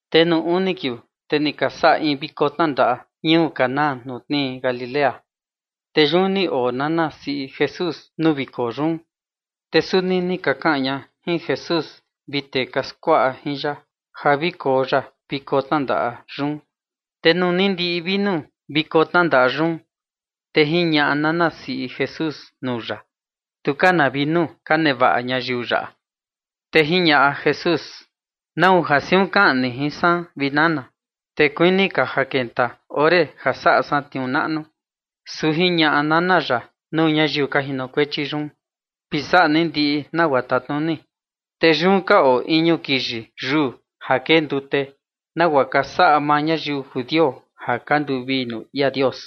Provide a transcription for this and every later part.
Te nuu uni ka kiuu, te ni ka saꞌa in viko tnandaꞌa ñuu Caná ja tnii Galilea, te yun ni oo nana siꞌi Jesús nuu viko yun. Te suni ni ka kaꞌan ña jin Jesús vi tee ka skuaꞌa jin ya ja vi koo ya nuu viko tnandaꞌa yun. Te nuu ni ndiꞌi vinu viko tnandaꞌa yun, te jiñaꞌa nana siꞌi Jesús nuu ya: ―Tu ka na vinu ka nevaꞌa ñayiu yaꞌa. Te jiñaꞌa Jesús: ―¿Nau ja siun kaꞌan ni jin san, vi nana? Te kuini ka ja kenta ore ja saꞌa san tniuu naꞌnu. Su jiñaꞌa nana ya nuu ñayiu ka jinokuechi yun: ―Vi saꞌa ni ndiꞌi nagua tatnuni. Te yun ka oo iñu kiyi yuu ja kee ndute, nagua ka saꞌa maa ñayiu judio ja ka nduvii nuu ia Dios,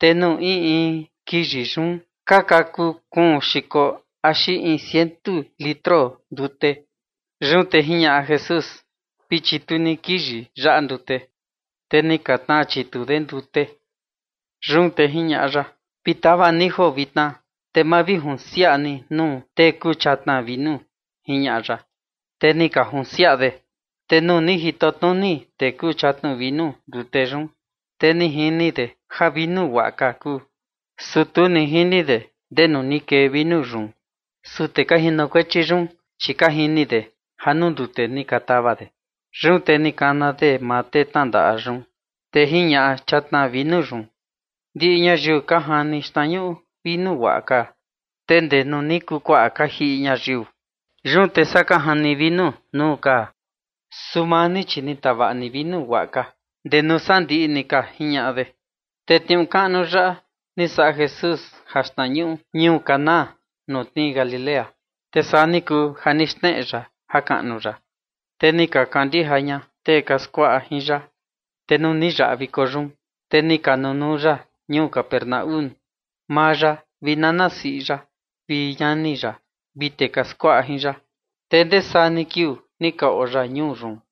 te nuu in in kiyi yun ka kakuu kuun xiko axi in ciento litro ndute. Yun te jiñaꞌa Jesús: ―Vi chitu ni kiyi yaꞌa ndute. Te ni ka tnaa chitu de ndute. Yun te jiñaꞌa ya: ―Vi tau ni joo vitna, te mavijunsiaꞌa ni nuu tee kuu chatna vinu ―jiñaꞌa ya. Te ni ka junsiaꞌa de. Te nuu ni jito tnuni tee kuu chatna vinu ndute yun, te ni jini de ja ni vinu guaꞌa ka kuu, su tu ni jini de ndenu ni kee vinu yun. Su tee ka jinokuechi yun, chi ka jini de ja nuu ndute ni ka tau de. Yun te ni kana de maa tee tnandaꞌa yun. Te jiñaꞌa chatna vinu yun: ―Ndiꞌi ñayiu ka jani xtnañuꞌu vinu guaꞌa ka, te ndee nuu ni kuu kuaꞌa ka jiꞌi ñayiu, yun te saa ka jani vinu nuu ka. Su maa ni, chi ni tavaꞌa ni vinu guaꞌa ka, guaa ndee nuu sandiꞌi ni ka ―jiñaꞌa de. Te tniuu kaꞌnu yaꞌa ni saꞌa Jesús jaxtnañuꞌu ñuu Caná ja tnii Galilea. Te saa ni kuu ja ni xneꞌe ya jakaꞌnu ya, te ni ka kandija ña tee ka skuaꞌa jin ya. Te nuu ni yaꞌa viko yun, te ni ka nunuu ya ñuu Capernaúm, maa ya vi nana siꞌi ya vi ñani ya vi tee ka skuaꞌa jin ya. Te ndesaa ni kiuu ni ka oo ya ñuu yun.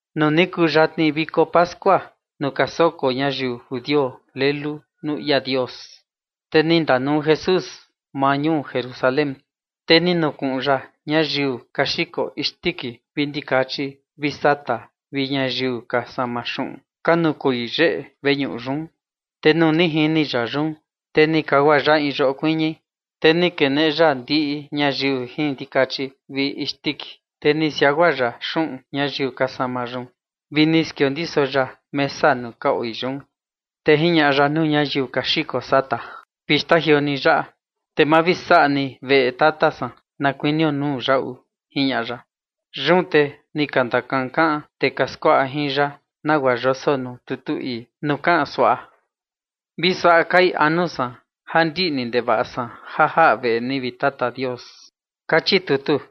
Nuu ni kuu yatni viko pascua nuu ka soko ñayiu judio lelu nuu ia Dios, te ni ndanuu Jesús maa ñuu Jerusalén. Te ni nukuꞌun ya ñayiu ka xiko isndiki vi ndikachi vi sata vi ñayiu ka sama xuꞌun, ka nukoi yeꞌe veñuꞌu yun. Te nuu ni jini ya yun, te ni kagua ya in yoꞌo kuiñi, te ni keneꞌe ya ndiꞌi ñayiu jin ndikachi vi isndiki, te ni siagua ya xuꞌun ñayiu ka sama yun vi ni skiondiso ya mesa nuu ka oi yun. Te jiñaꞌa ya nuu ñayiu ka xiko sata: ―Vi xtajioo ni ja yaꞌa, te ma vi saꞌa ni veꞌe Tata san na kuinio nuu yaꞌu ―jiñaꞌa ya. Yun te ni ka ndakankaꞌan tee ka skuaꞌa jin ya nagua yoso nuu tutu ii, nuu kaꞌan suaꞌa: “Chi vi suaꞌa kai anu san ja ndiꞌni ndevaꞌa san ja jaꞌa veꞌe ni, vi Tata Dios”, kachi tutu.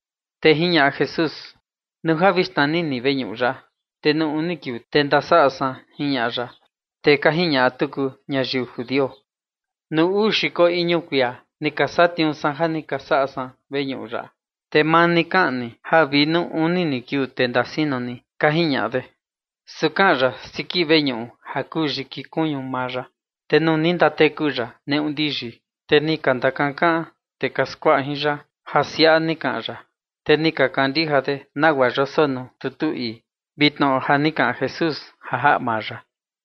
Te jiñaꞌa Jesús: ―Nuu ja vi xnani ni veñuꞌu yaꞌa, te nuu uni kiuu, te ndasaꞌa san ―jiñaꞌa ya. Te ka jiñaꞌa tuku ñayiu judio: ―Nuu uu xiko iñu kuia ni ka satniuu san ja ni ka saꞌa san veñuꞌu yaꞌa, te maa ni kaꞌan ni ja vi nuu uni ni kiuu, te ndasino ni ―ka jiñaꞌa de. Su kaꞌan ya siki veñuꞌu ja kuu yiki kuñu maa ya. Te nuu ni ndateku ya neꞌu ndiyi, te ni ka ndakankaꞌan tee ka skuaꞌa jin ya ja siaꞌa ni kaꞌan ya, te ni ka kandija de nagua yoso nuu tutu ii, vi tnoꞌo ja ni kaꞌan Jesús ja jaꞌa maa ya.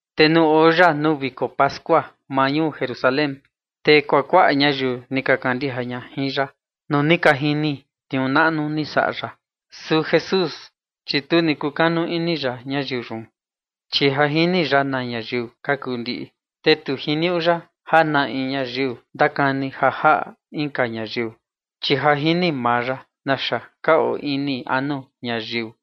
Te nuu oo ya nuu viko pascua maa ñuu Jerusalén, te kuakuaꞌa ñayiu ni ka kandija ña jin ya nuu ni ka jini tniuu naꞌnu ni saꞌa ya. Su Jesús, chi tu ni kukanu ini ya ñayiu yun, chi ja jini ya na ñayiu ka kuu ndiꞌi. Te tu jiniuꞌu ya ja na in ñayiu ndakani ja jaꞌa inka ñayiu, chi ja jini maa ya naxa ka oo ini anu ñayiu.